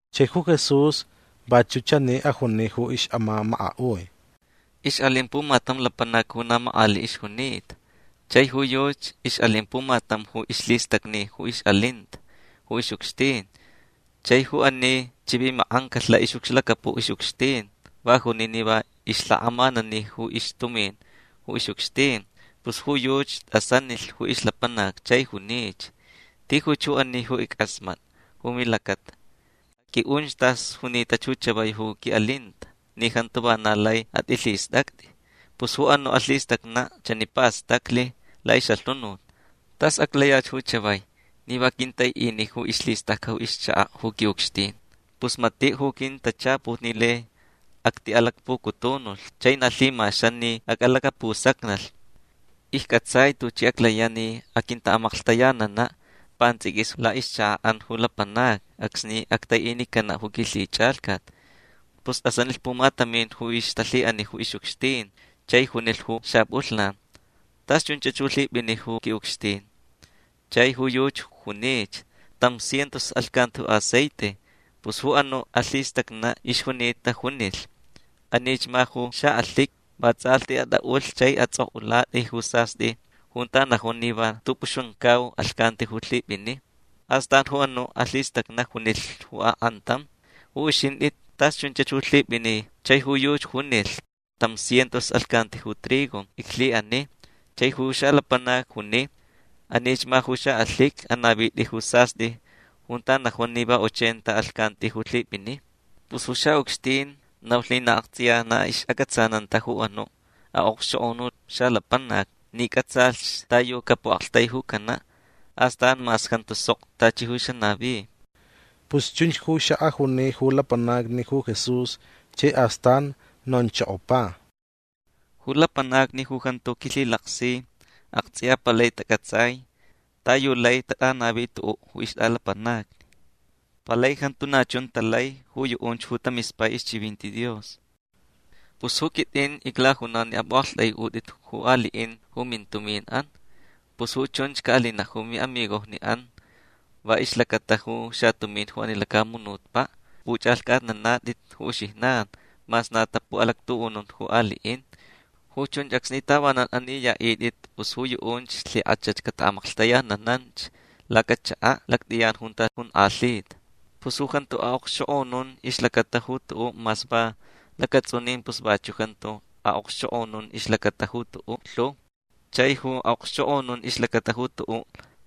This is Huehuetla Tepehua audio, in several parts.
Chai ju Jesús vachuʼ chani ajuni ju ixʼamamakaʼui: ―Ixʼalin pumatam lapanac ju na makʼaliʼ ixjunita. Chai ju yuchi ixʼalin pumatam ju ixlhistacni ju ixʼalinta ju ixʼucxtin. Chai ju ani chivimakʼancalh laʼixʼucxlacapuʼ ju ixʼucxtin. Va juni ni va ixlhakʼamanani ju ixtumin ju ixʼucxtin. Pus ju yuchi tʼasanilh ju ixlapanac chai junich: “Tijuch ju ani ju ickʼasmatʼa ju milacata. Aqʼuiʼunch tas junitach ju chavai ju quiʼalinta ni jantu vana lai atʼilhistʼactʼi”. Pus ju anuʼ alhistacnaʼ chani pastaclh laʼixʼalhunut. “Tas aclayach ju chavai ni va quintaiʼini ju ixlhistʼacʼa ju ixchakaʼ ju quiʼucxtin. Pus matiʼ ju quintachaput ni lai actiʼalacpucutunulh. Chai na lhimaxan ni acʼalacapusacnalh. Iccʼatsai tuchi aclayaʼ ni aquintaʼamaklhtayananaʼ pantsʼiquis laʼixchakaʼan ju lapanacni acsni actaiʼinicanaʼ ju quilhichʼalhcat”. Pus tʼasanilh pumatamin ju ixtalhiʼani ju ixʼucxtin chai junilh ju xapʼulhnan: “Tas chunchach ju lhipʼini ju quiʼucxtin”. Chai ju yuchi junich: “Tam cientos alhcanti ju aceite”. Pus ju anuʼ alhistacnaʼ ixjunita junilh: “Anich ma ju xaʼalhiqui. Va tsʼalhti atʼaʼulhch chai atsʼokʼulatʼi ju sastʼi junta najun ni va tʼupʼuxamcau alhcanti ju lhipʼini”. Astan ju anuʼ alhistacnaʼ junilh ju akʼantam: “Ju uxintʼi tas chunchach ju lhipʼini”. Chai ju yuchi junilh: “Tam cientos alhcanti ju trigo iclhiʼani”. Chai ju xalapanac juni: “Anich ma ju xaʼalhiqui. Anavitʼi ju sastʼi junta najun ni va ochenta alhcanti ju lhipʼini”. Pus ju xaʼucxtin naulh ni aktsʼiya na ixʼacʼatsananta ju anuʼ aʼokxchokʼonuʼ xalapanac ni cʼatsalh ta yu capuʼaktaijucanaʼ astan mas jantu sok tachi ju xanavi. Pus chunch ju xaʼajuni ju lapanacni ju Jesús chai astan nonchokopa: ―Ju lapanacni ju jantu quilhilaksi aktsʼiya palai tacʼatsai ta yu lai tatʼanavi tuʼuʼ ju ixtʼalapanacni. Palai jantu na chun talai ju yuʼunch ju tamispai ixchivinti Dios. Pus ju quitʼin iclajunau ni apʼuʼaktʼaiʼutʼit ju aliʼin ju mintuminʼan. Pus ju chunch caʼalinaʼ ju miʼamigojniʼan va ixlacata ju xatumin ju ani lacamunutpaʼ ju xapʼuchʼalhcʼatnanatʼit ju uxijnan mas na tapuʼalactuʼunun ju aliʼin. Ju chunch acsni tavanan aniyaʼitʼit pus ju yuʼunch lhikʼach cataʼamaklhtayanananch lacachakaʼ lactʼiyan junta jonkʼalhita. Pus ju jantu aʼokxchokʼonun ixlacata ju tuʼuʼ mas va lacatsʼunin pus vachuʼ jantu aʼokxchokʼonun ixlacata ju tuʼuʼ lhu. Chai ju aʼokxchokʼonun ixlacata ju tuʼuʼ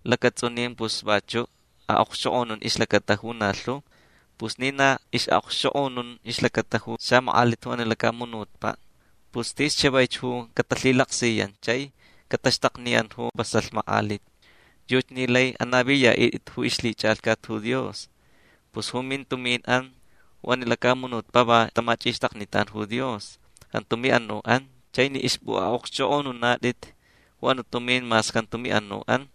lacatsʼunin pus vachuʼ aʼokxchokʼonun ixlacata ju na lhu. Pus ni na ixʼaʼokxchʼokʼonun ixlacata ju xamakʼalit ju ani lacamunutpaʼ pus tis chavaich ju catalhilaksiyan chai cataxtakniyan ju vasalh makʼalit. Yuchi ni lai anaviyaʼitʼit ju ixlhichʼalhcat ju Dios. Pus ju mintuminʼan ju ani lacamunutpaʼ va tamachʼixtaknitan ju Dios. Jantu miʼanuʼan. Chai ni ixpʼuʼaʼokxchʼokʼonunatʼit ju anuʼ tumin mas jantu miʼanuʼan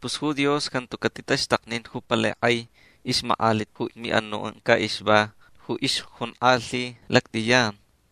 pus ju Dios jantu catitaxtaknin ju palai kʼai ixmakʼalit ju miʼanuʼan caʼixva ju ixjonkʼalhi lactʼiyan.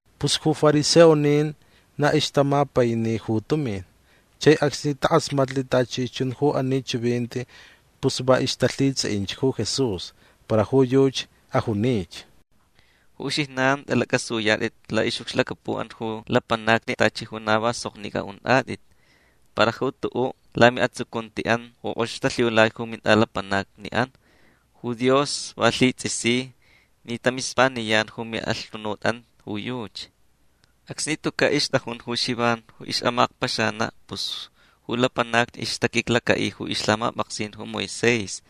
Pus ju fariseonin na ixtamapaini ju tumin. Chai acsni takʼasmatlh tachi chun ju ani chivinti pus va ixtalhitsʼiʼinch ju Jesús. Para ju yuchi ajunich: ―Ju uxijnan tʼalacʼasuyatʼit laʼixʼucxlacapuʼan ju lapanacni tachi ju na va soknicʼa untʼatʼit. Para ju tuʼuʼ lamiʼatsucuntiʼan ju kʼox talhiulai ju mintʼalapanacniʼan ju Dios va lhitsʼisi ni tamispaniyan ju miʼalhunutʼan ju yuchi. Acsni tucaʼ ixtʼajun ju Xivan ju ixʼamakpaxanaʼ pus ju lapanacni ixtaquiclacaʼi ju ixlhamapʼaksin ju Moisés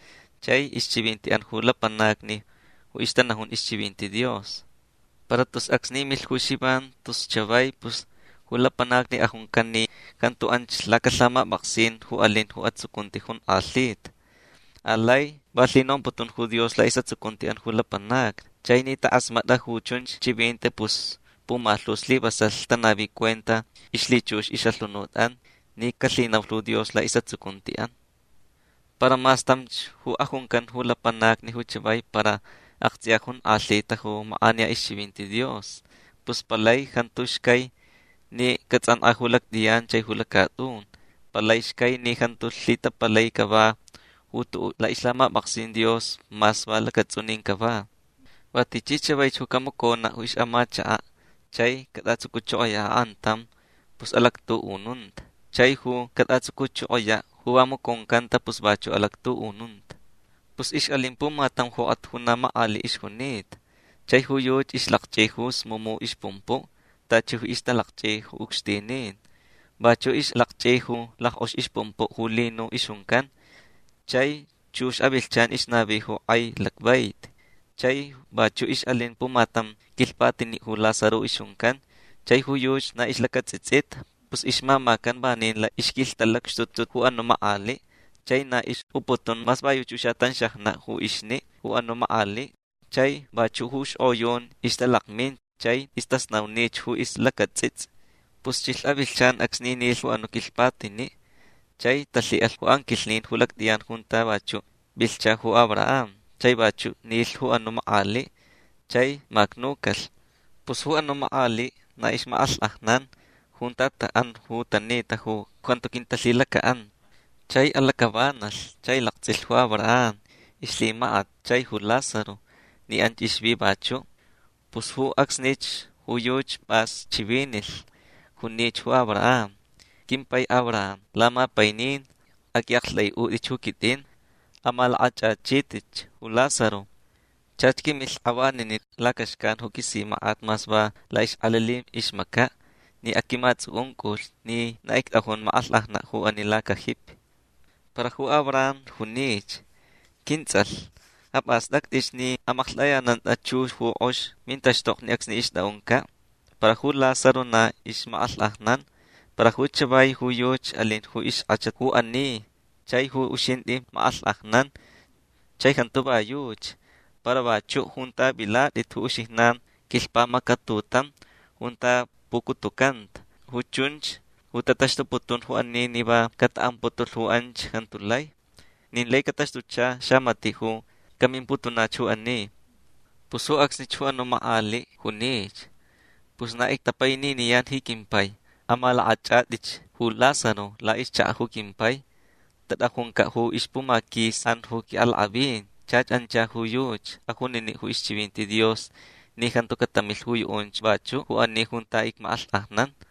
chai ixchivintiʼan ju lapanacni ju ixtanajun ixchivinti Dios. Para tus acsni milh ju Xivan tus chavai pus ju lapanacni ajuncan ni jantu anch lacalhamapʼaksin ju alin ju atsucunti jonkʼalhita. Alai va lhinomputun ju Dios laʼisʼatsucuntiʼan ju lapanacni. Chai ni takʼasmatʼa ju chunch chivinti pus pumalhu slivasalh tanavi cuenta ixlhichux ixʼalhunutʼan ni calhinaulh ju Dios laʼisʼatsucuntiʼan. Para mas tamch ju ajuncan ju lapanacni ju chavai para aktsʼiya jonkʼalhita ju makʼaniya ixchivinti Dios. Pus palai jantu xcai ni catsʼankʼa ju lactʼiyan chai ju lacatʼun. Palai xcai ni jantu lhitapalai cava ju tuʼuʼ laʼixlhamapʼaksin Dios mas va lacatsʼunin cava. Va tichi chavaich ju camaconaʼ ju ixʼamachakaʼ chai catʼatsucuchokoyaʼ akʼantam pus alactuʼununta. Chai ju catʼatsucuchokoyaʼ ju va maconcanta pus vachuʼ alactuʼununta. Pus ixʼalin pumatam jokʼat ju na makʼaliʼ ixjunita. Chai ju yuchi ixlakchʼi ju smumu ixpumpuʼ tachi ixtalakchʼi ju ucxtinin. Vachuʼ ixlakchʼi ju lackʼox ixpumpuʼ ju lino ixjuncan. Chai chux avilhchan ixnavi ju kʼai lacvaiti. Chai vachuʼ ixʼalin pumatam quilhpatiniʼ ju Lázaro ixjuncan. Chai ju yuchi na ixlacatsʼitsʼita. Pus ixmamacan vanin laʼixquilhtalacxtutu ju anuʼ makʼaliʼ. Chai na ixʼuputun mas va yuchi ju xaʼatanxajnaʼ ju ixniʼ ju anuʼ makʼaliʼ. Chai vachuʼ ju xkʼoyun ixtalakmin chai istasnaunich ju ixlacatsʼitsʼi. Pus chilh avilhchan acsni nilh ju anuʼ quilhpatiniʼ chai talhiʼalh ju anquilhnin ju lactʼiyan junta vachuʼ vilhcha ju Abraham. Chai vachuʼ nilh ju anuʼ makʼaliʼ. Chai macnucalh. Pus ju anuʼ makʼaliʼ na ixmakʼalhkʼajnan junta taʼan ju tanita ju jantu talhilacaʼanta ju Jesús. Chai alacʼavanalh chai laktsʼilh ju Abraham ixlhimakat chai ju Lázaro ni anch ixvi vachuʼ. Pus ju acsnich ju yuchi pʼas chivinilh. Junich ju Abraham: “Quimpai Abraham lamapainin aqʼuiʼaktʼaiʼutʼich ju quitʼin. Amalakʼachʼachitʼich ju Lázaro. Chach quimilh kʼavaniniʼ lacaxcan ju quisimakʼat mas va laʼixkʼelili ixmacaʼ ni aquimatsʼucʼuncʼulhch ni na ictʼajun makʼalhkʼajnanch ju ani lacajipi”. Para ju Abraham junich: “Quintsʼalh apʼastʼactʼich ni amaklhtʼayanantʼa chux ju kʼox mintaxtokni acsni ixtʼaʼuncaʼ. Para ju Lázaro na ixmakʼalhkʼajnan. Para ju chavai ju yuchi alin ju ixkʼachat ju ani chai ju uxintʼi makʼalhkʼajnan. Chai jantu va yuchi. Para vachuʼ junta vilatʼit ju uxijnan quilhpamacatutam junta pucutucanta. Ju chunch ju tataxtuputun ju ani ni va cataʼamputulh ju anch jantu lai. Nin lai cataxtucha xamatiʼ ju camimputunach ju ani”. Pus ju acsnich ju anuʼ makʼaliʼ junich: “Pus na ictapaininiyan ji quimpai. Amalakʼachʼatʼich ju Lázaro laʼixchakaʼ ju quimpai. Tatʼajuncaʼ ixpumaquisiʼan ju quiʼalakʼavin. Chach ancha ju yuchi ajuniniʼ ju ixchivinti Dios ni jantu catamilh ju yuʼunch vachuʼ ju ani junta icmakʼalhkʼajnan”.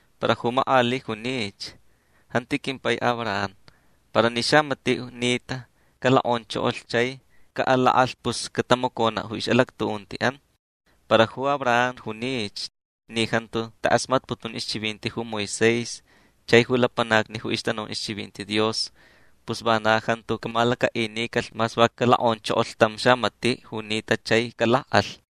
Para ju makʼaliʼ junich: “Janti quimpai Abraham. Para ni xamatiʼ ju nita calokʼonchokolh chai caʼalakʼalh pus catamaconaʼ ju ixʼalactuʼuntiʼan”. Para ju Abraham junich: “Ni jantu takʼasmatputun ixchivinti ju Moisés chai ju lapanacni ju ixtanajun ixchivinti Dios pus vana jantu camalacaʼinicalh mas va calokʼonchokolh tam xamatiʼ ju nita chai calakʼalh”.